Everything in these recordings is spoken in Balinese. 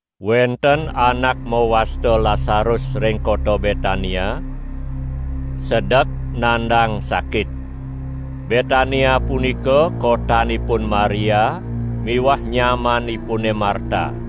Wenten anak mawasta Lasarus ring kota Betania, sedek nandang sakit. Betania punika kotanipun Maria miwah nyamanipune Marta. (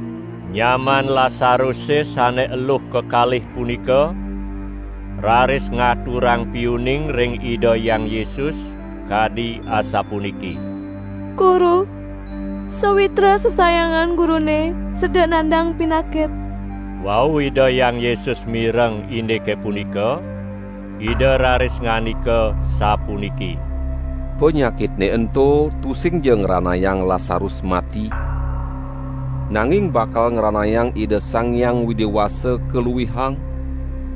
Nyaman Lasaruse sane eluh kekalih punika raris ngaturang piuning ring Ida Hyang Yesus kadi asapuniki: "Guru, sawitra sesayangan Gurune sedek nandang pinakit." Wau Ida Hyang Yesus mireng indike punika, Ida raris ngandika sapuniki: "Panyakitne ento tusingja ngranayang Lasarus mati, nanging bakal ngranayang Ida Sang Hyang Widi Wasa kaluihang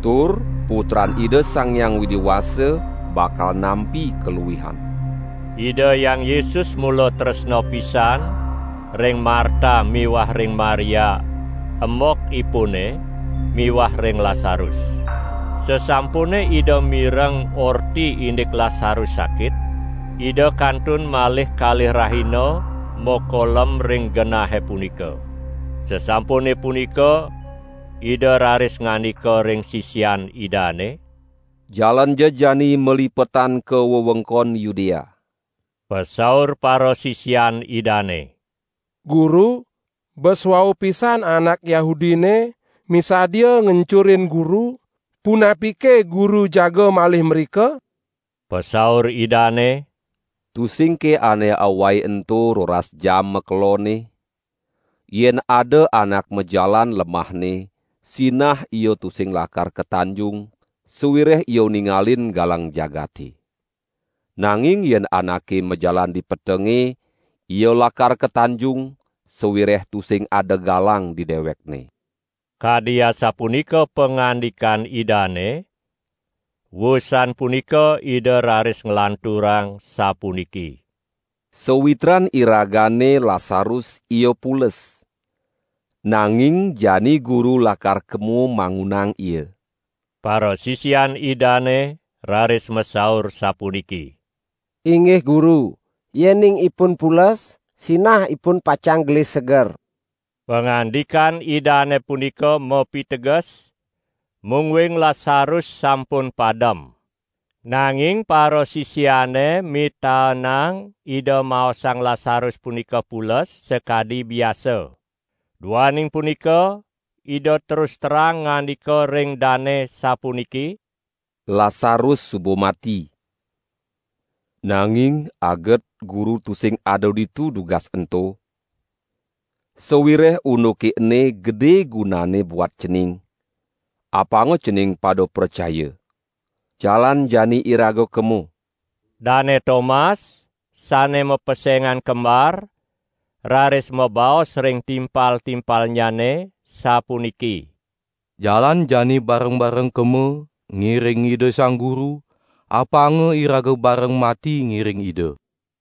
tur Putran Ida Sang Hyang Widi Wasa bakal nampi kaluihan." Ida Hyang Yesus mula tresna pisan ring Marta miwah ring Maria embokipune miwah ring Lasarus. Sasampune Ida mireng orti indik Lasarus sakit, Ida kantun malih kalih rahina makolem ring genahe punika. Sasampune punika Ida raris ngandika ring sisian Idane: "Jalanja jani malipetan ka wewengkon Yudea." Pasaur parasisian Idane: "Guru, bes wau pisan anak Yahudine misadia ngencurin Guru; punapike Guru jaga malih mrika?" Pasaur Idane: "Tusingke ane awai ento roras jam makelonne? Yen ada anak majalan lemahne sinah ia tusing lakar katanjung, sawireh ia ningalin galang jagate. Nanging yen anake majalan di petenge, ia lakar katanjung, sawireh tusing ada galang di dewekne." Kadi asapunika pangandikan Idane; wusan punika Ida raris nglanturang sapuniki: "Sawitran iragane Lasarus ia pules, nanging jani Guru lakar kema mangunang ia!" Parasisian Idane raris masaur sapuniki: "Inggih Guru, yening ipun pules sinah ipun pacang gelis seger!" Pangandikan Idane punika mapiteges, mungguing Lasarus sampun padem. Nanging parasisiane mitaenang Ida maosang Lasarus punika pules sakadi biasa. Duaning punika Ida terus terang ngandika ring dane sapuniki: "Lasarus suba mati. Nanging aget Guru tusing ada ditu dugas ento, sawireh unduke ene gede gunanne buat cening, apanga cening pada pracaya. Jalan jani iraga kema!" Dane Tomas (sane mapesengan Kembar) raris mabaos ring timpal-timpalnyane sapuniki: "Jalan jani bareng-bareng kema ngiring Ida Sang Guru, apanga iraga bareng mati ngiring Ida!"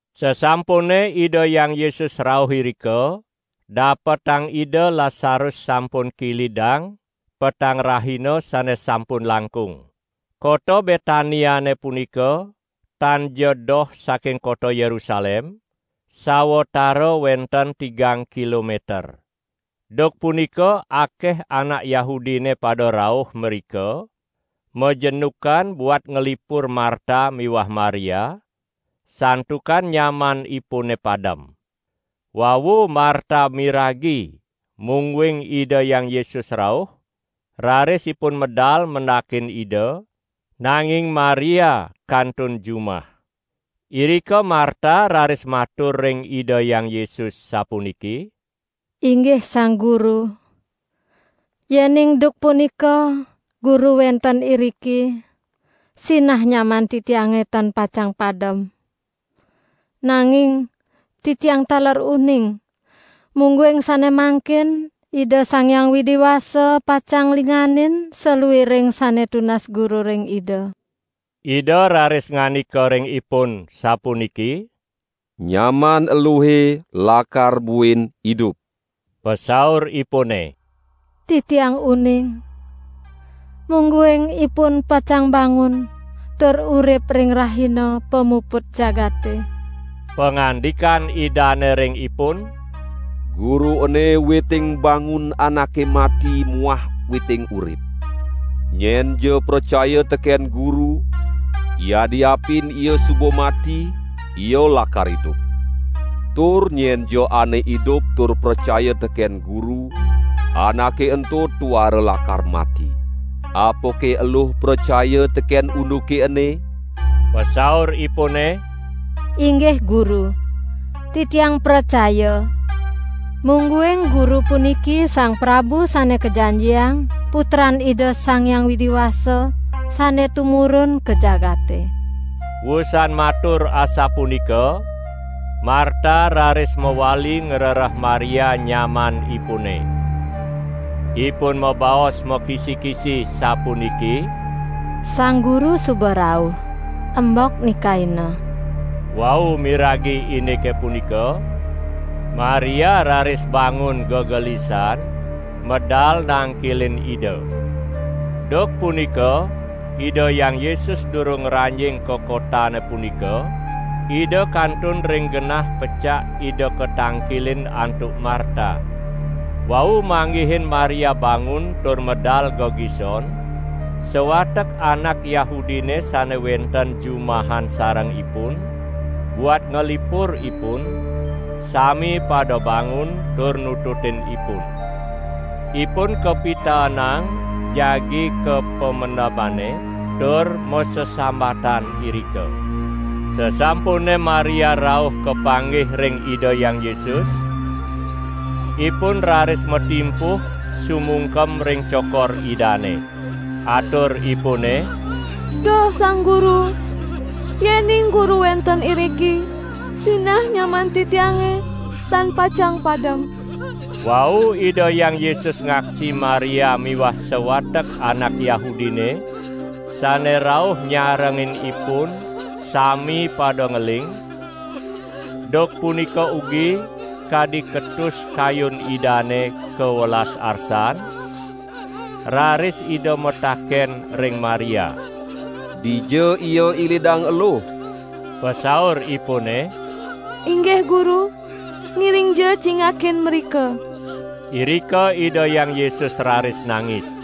Sasampune Ida Hyang Yesus rauh irika, dapetang Ida Lasarus sampun kilidang petang rahina sane sampun langkung. Kota Betaniane punika tanja doh saking kota Yerusalem, sawatara wenten tigang kilometer. Duk punika akeh anak Yahudine pada rauh mrika majenukan buat nglipur Marta miwah Maria, santukan nyamanipune padem. Wau Marta miragi mungguing Ida Hyang Yesus rauh, raris ipun medal mendakin Ida, nanging Maria kantun jumah. Irika Marta raris matur ring Ida Hyang Yesus sapuniki: "Inggih Sang Guru, yening duk punika Guru wenten iriki sinah nyaman titiange tan pacang padem! Nanging titiang taler uning, mungguing sane mangkin Ida Sang Hyang Widi Wasa pacang nglingganin saluiring sane tunas Guru ring Ida." Ida raris ngandika ring ipun sapuniki: "Nyaman eluhe lakar buin idup!" Pasauripune: "Titiang uning, mungguing ipun pacang bangun tur urip ring rahina pamuput jagate." Pangandikan Idane ring ipun: "Guru ene witing bangun anake mati muah witing urip. Nyenja pracaya teken Guru, yadiapin ia suba mati, ia lakar idup. Tur nyenja ane idup tur pracaya teken Guru, anake ento tuara lakar mati. Apake eluh pracaya teken unduke ene?" Pasauripune: "Inggih Guru, titiang pracaya, mungguing Guru puniki Sang Prabu Sane Kajanjiang, Putran Ida Sang Widi Wasa, sane tumurun ka jagate." Wusan matur asapunika Marta raris mawali ngrereh Maria nyamanipune. Ipun mabaos makisi-kisi sapuniki: "Sang Guru suba rauh, embok nikaina!" Wau miragi indike punika, Maria raris bangun gegelisan medal nangkilin Ida. ( Duk punika Ida Hyang Yesus durung ngranjing ka kotane punika, Ida kantun ring genah pecak Ida katangkilin antuk Marta.) Wau manggihin Maria bangun tur medal gegison, sawatek anak Yahudine sane wenten jumahan sareng ipun, buat nglipur ipun, sami pada bangun tur nututin ipun. Ipun kapitaenang jagi ka pamendemane tur masesambatan irika. Sasampune Maria rauh kapanggih ring Ida Hyang Yesus, ipun raris matimpuh sumungkem ring cokor Idane. Aturipune: "Duh Sang Guru, yening Guru wenten iriki, sinah nyaman titiange tan pacang padem!" Wau Ida Hyang Yesus ngaksi Maria miwah sawatek anak Yahudine sane rauh nyarengin ipun sami pada ngeling, duk punika ugi kadi ketus kayun Idane, kawelas arsan, raris Ida mataken ring Maria: "Dija ia ilidang eluh?" Pasauripune: "Inggih Guru, ngiringja cingakin mrika!" Irika Ida Hyang Yesus raris nangis.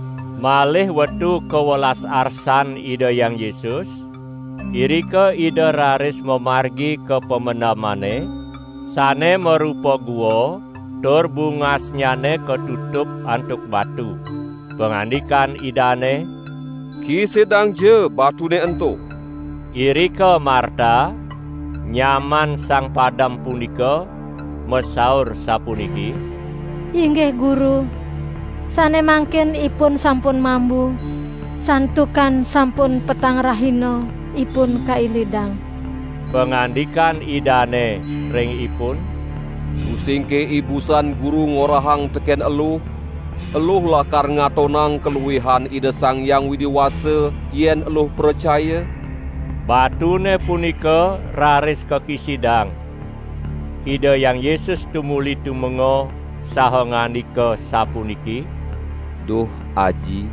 Malih wetu kawelas arsan Ida Hyang Yesus, irika Ida raris mamargi ka pamendemane, sane marupa gua tur bungasnyane katutup antuk batu. Pangandikan Idane: "Kisidangja batune ento!" Irika Marta, nyaman sang padem punika masaur sapuniki: "Inggih Guru, sane mangkin ipun sampun mambu, santukan sampun petang rahina ipun kailidang." Pangandikan Idane ring ipun: "Tusingke ibusan Guru ngorahang teken eluh, eluh lakar ngatonang kaluihan Ida Sang Hyang Widi Wasa yen eluh pracaya?" Batune punika raris kakisidang. Ida Hyang Yesus tumuli tumenga saha ngandika sapuniki: "Duh Aji,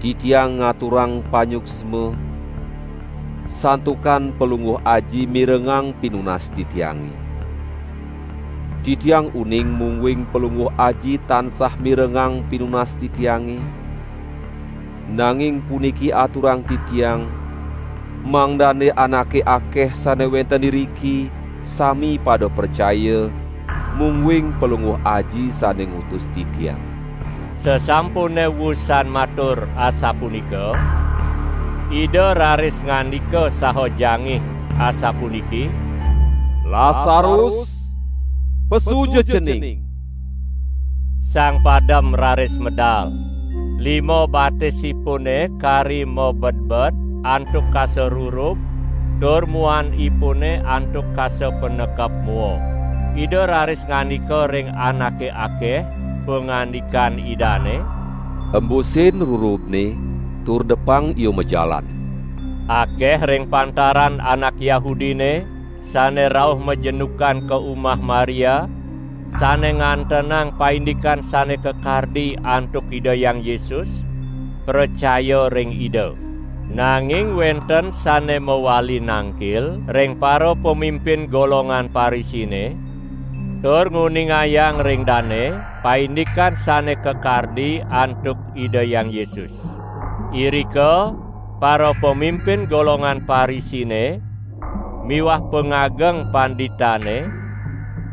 Titiang ngaturang panyuksma, santukan Palungguh Aji mirengang pinunas Titiange. Titiang uning mungguing Palungguh Aji tansah mirengang pinunas Titiange, nanging puniki aturang Titiang, mangdane anake akeh sane wenten iriki, sami pada pracaya, mungguing Palungguh Aji sane ngutus Titiang." Sasampune wusan matur asapunika, Ida raris ngandika saha jangih asapuniki: "Lasarus, pesuja cening!" Sang padem raris medal, lima batisipune kari mabedbed antuk kasa rurub tur muanipune antuk kasa panekep mua. Ida raris ngandika ring anake akeh, pangandikan Idane: "Embusin rurubne tur depang ia majalan!" Akeh ring pantaran anak Yahudine sane rauh majenukan ka umah Maria, sane ngantenang paindikan sane kakardi antuk Ida Hyang Yesus, pracaya ring Ida. Nanging wenten sane mawali nangkil ring parapamimpin golongan Parisine, tur nguningayang ring dane paindikan sane kakardi antuk Ida Hyang Yesus. Irika parapamimpin golongan Parisine miwah pangageng panditane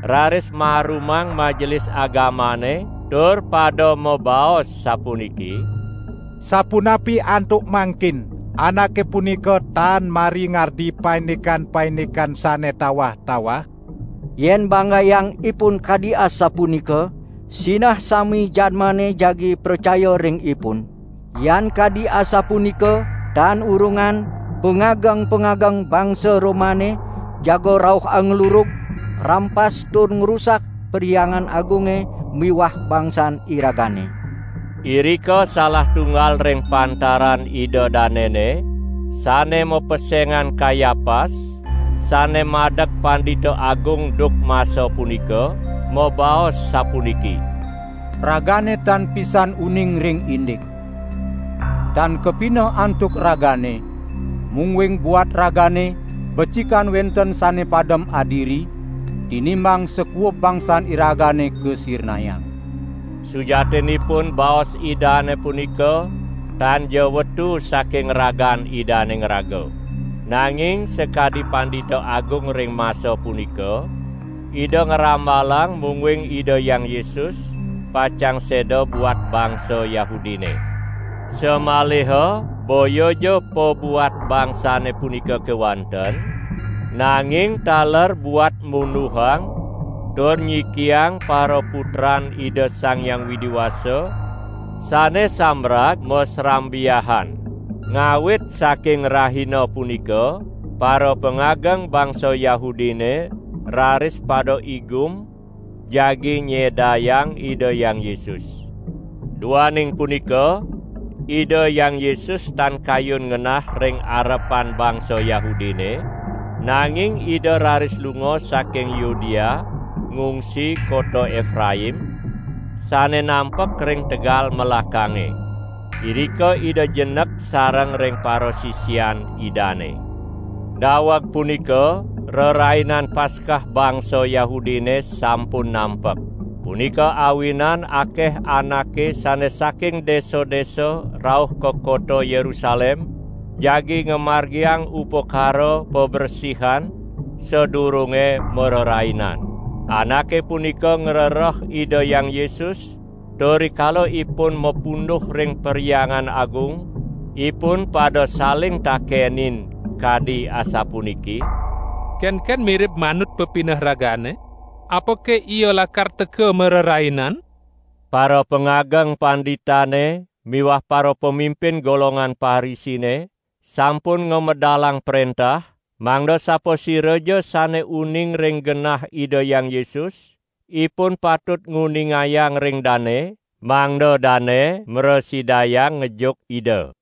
raris marumang Majelis Agamane tur pada mabaos sapuniki: "Sapunapi antuk mangkin? Anake punika tan mari ngardi paindikan-paindikan sane tawah-tawah! Yen banggayang Ipun kadi asapunika, sinah sami jadmane jagi pracaya ring Ipun. Yan kadi asapunika tan urungan pangageng-pangageng bangsa Romane jaga rauh anglurug, ngrampas tur ngrusak Perhyangan Agunge miwah bangsan iragane." Irika salah tunggal ring pantaran ida danene, sane mapesengan Kayapas, sane madeg Pandita Agung duk masa punika, mabaos sapuniki: "Ragane tan pisan uning ring indik! Tan kapineh antuk ragane, mungguing buat ragane becikan wenten sane padem adiri tinimbang sakuub bangsan iragane kasirnayang?" Sujatinipun baos idane punika tanja wetu saking ragan idane ngraga. Nanging sakadi Pandita Agung ring masa punika, ida ngramalang mungguing Ida Hyang Yesus pacang seda buat bangsa Yahudine. Samaliha boyaja pabuat bangsane punika kewanten, nanging taler buat munduhang tur nyikiang paraputran Ida Sang Hyang Widi Wasa sane sambrag masrambiahan. Ngawit saking rahina punika parapangageng bangsa Yahudine raris pada igum jagi nyedayang Ida Hyang Yesus. Duaning punika Ida Hyang Yesus tan kayun ngenah ring arepan bangsa Yahudine, nanging Ida raris lunga saking Yudea ngungsi kota Epraim, sane nampek ring tegal melakange. Irika Ida jenek sareng ring parasisian Idane. Daweg punika Rerainan Paskah bangsa Yahudine sampun nampek. Punika awinan akeh anake sane saking desa-desa rauh ka kota Yerusalem jagi ngamargiang upakara pabresihan sadurunge marerainan. Anake punika ngrereh Ida Hyang Yesus tur rikala ipun mapunduh ring Perhyangan Agung, ipun pada saling takenin kadi asapuniki: "Kenken mirib manut pepineh ragane? Apake Ia lakar teka marerainan?" Parapangageng panditane miwah parapamimpin golongan Parisine sampun ngamedalang prentah, mangda sapasiraja sane uning ring genah Ida Hyang Yesus, ipun patut nguningayang ring dane, mangda dane mrasidayang ngejuk Ida.